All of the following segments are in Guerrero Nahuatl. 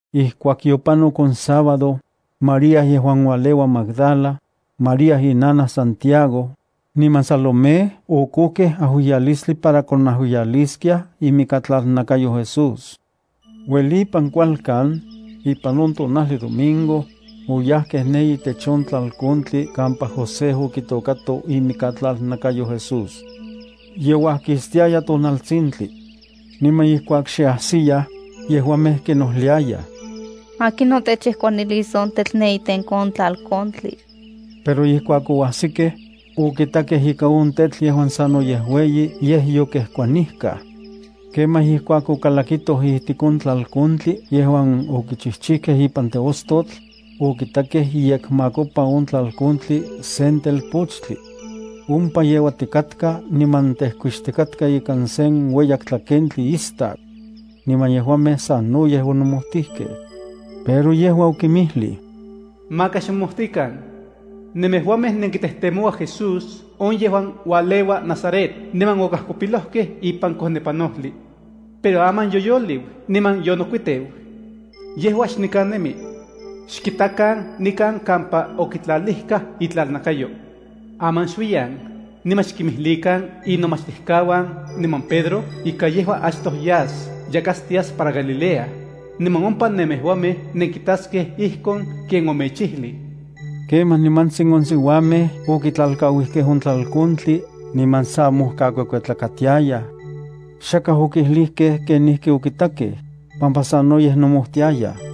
Ijkuak yopanok on sábado, María yejuan ualeua Magdala, María inanaj Santiago, niman Salomé okojkej ajuiyalistli para konajuiyaliskiaj itlalnakayo Jesús. Uelipan kualkan, ipan on tonajli domingo, oyajkej ne itech on tlalkontli kampa José okitôkato imikatlalnakayo Jesús. Ye uajkistiaya tonaltsintli. Niman ijkuak xe ajsiyaj, yejuamej kinojliayaj: —¿Akinon techejkuanilis on tetl ne itenko on tlalkontli? Pero ijkuak oajsikej, okitakej ika on tetl yejuan sanoyej ueyi yej yokejkuanijkaj. Kemaj ijkuak okalakitoj ijtik on tlalkontli yejuan okichijchijkej ipan teostotl, okitakej iyekmakopa on tlalkontli sen telpochtli. Ompa yeuatikatka niman tejkuixtika ikan sen ueyak tlakentli istak. Niman yejuamej sanoyej onomojtijkej. Pero yejua okinmijlij: —Maka xmomojtikan. Nemejuamej nenkitejtemouaj Jesús on yejuan ualeua Nazaret niman okajkopilojkej ipan kojnepanojli. Pero aman yoyoliu niman yonokuiteu. Yejua xnikan nemi. Xkitakan nikan kampa okitlalijkaj itlalnakayo. Aman xuiyan, niman xkinmjlikan inomachtijkauan niman Pedro ika yejua achtoj yas yakatstias para Gallilea, niman ompa nemejuamej nenkitaskej ijkon ken omechijlij. Kemaj nimantsin on siuamej okitlalkauijkej on tlalkontli niman sa mojkakuekuetlakatiayaj. Xakaj okijlijkej kenijki okitakej, pampa sanoyej nomojtiayaj.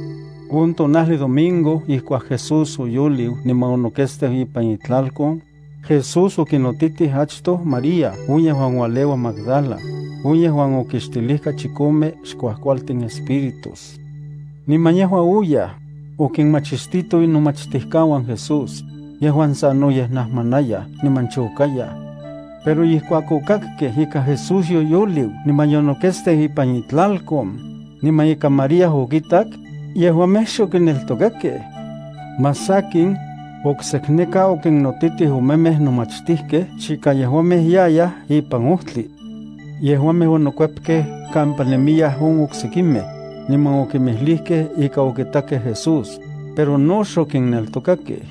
On tonajli domingo ijkuak Jesús oyoliu niman onoketsteu ipan itlalkon, Jesús okinotitij achtoj María on yejuan ualeua Magdala, on yejuan okixtilijka chikome xkuajkualtin espíritus. Niman yejua oyaj, okinmachistito inomachtijkauan Jesús, yejuan sanoyej najmanayaj, niman chokayaj. Pero ijkuak okakkej ika Jesús yoyoliu niman yonoketsteu ipan itlalkon, niman ika María okitak, yejuamej xokineltokakej. Más sakin, oksekneka okinnotitij omemej nomachtijkej chika yejuamej yayaj ipan ojtli. Yejuamej onokuepkej kampa nemiyaj on oksekimej, niman okinmijlijkej ika okitakej Jesús, pero no xokinneltokakej.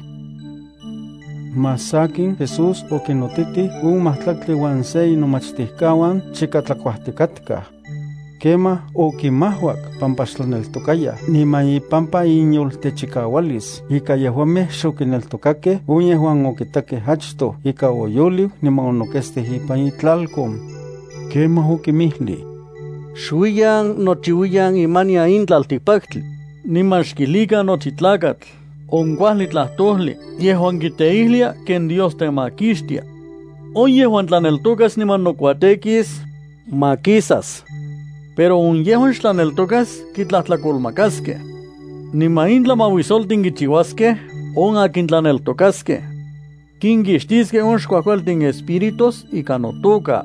Más sakin Jesús okinnotitij on majtlaktli uan se inomachtijkauan chika tlakuajtikatkaj. Kemaj okimajuak pampa xtlaneltokayaj niman ipampa inyoltechikaualis ika yejuamej xokinneltokakej on yejuan okitakej achtoj ika oyoliu niman onoketsteu ipan itlalkon. Kemaj okinmijlij: —Xuiyan nochiuiyan imanian in tlaltikpaktli, niman xkijlikan nochi tlakatl on kuajli tlajtojli yejuan kiteijlia ken Dios temakixtia. On yejuan tlaneltokas niman nokuatekis, makisas. Pero on yejuan xtlaneltokas kitlajtlakolmakaskej. Niman in tlamauisoltin kichiuaskej on akin tlaneltokaskej. Kinkixtiskej on xkuajkualtin espíritus ika notoka.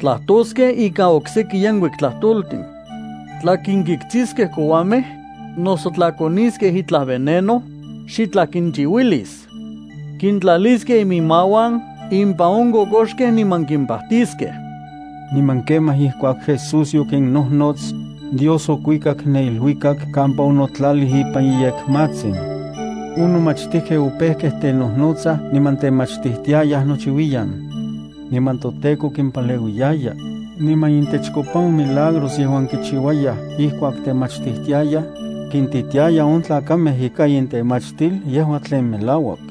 Tlajtoskej ikan okseki yenkuik tlajtoltin. Tla kinkitskiskej kouamej, noso tla koniskej itlaj veneno, xitlaj kinchiuilis. Kintlaliskej iminmauan impan on kokoxkej niman kimpajtiskej. Niman kemaj ijkuak Jesús yokinnojnots, Dios okuikak ne iluikak kampa onotlalij ipan iyekmatsin. On nomachtijkej opejkej tenojnotsaj niman temachtijtiayaj nochiuiyan. Niman toTEKO kimpaleuiyaya, niman itechkopa on milagros yejuan kichiuayaj ijkuak temachtijtiayaj, kintitiaya on tlakamej ika intemachtil yejua tlen melauak.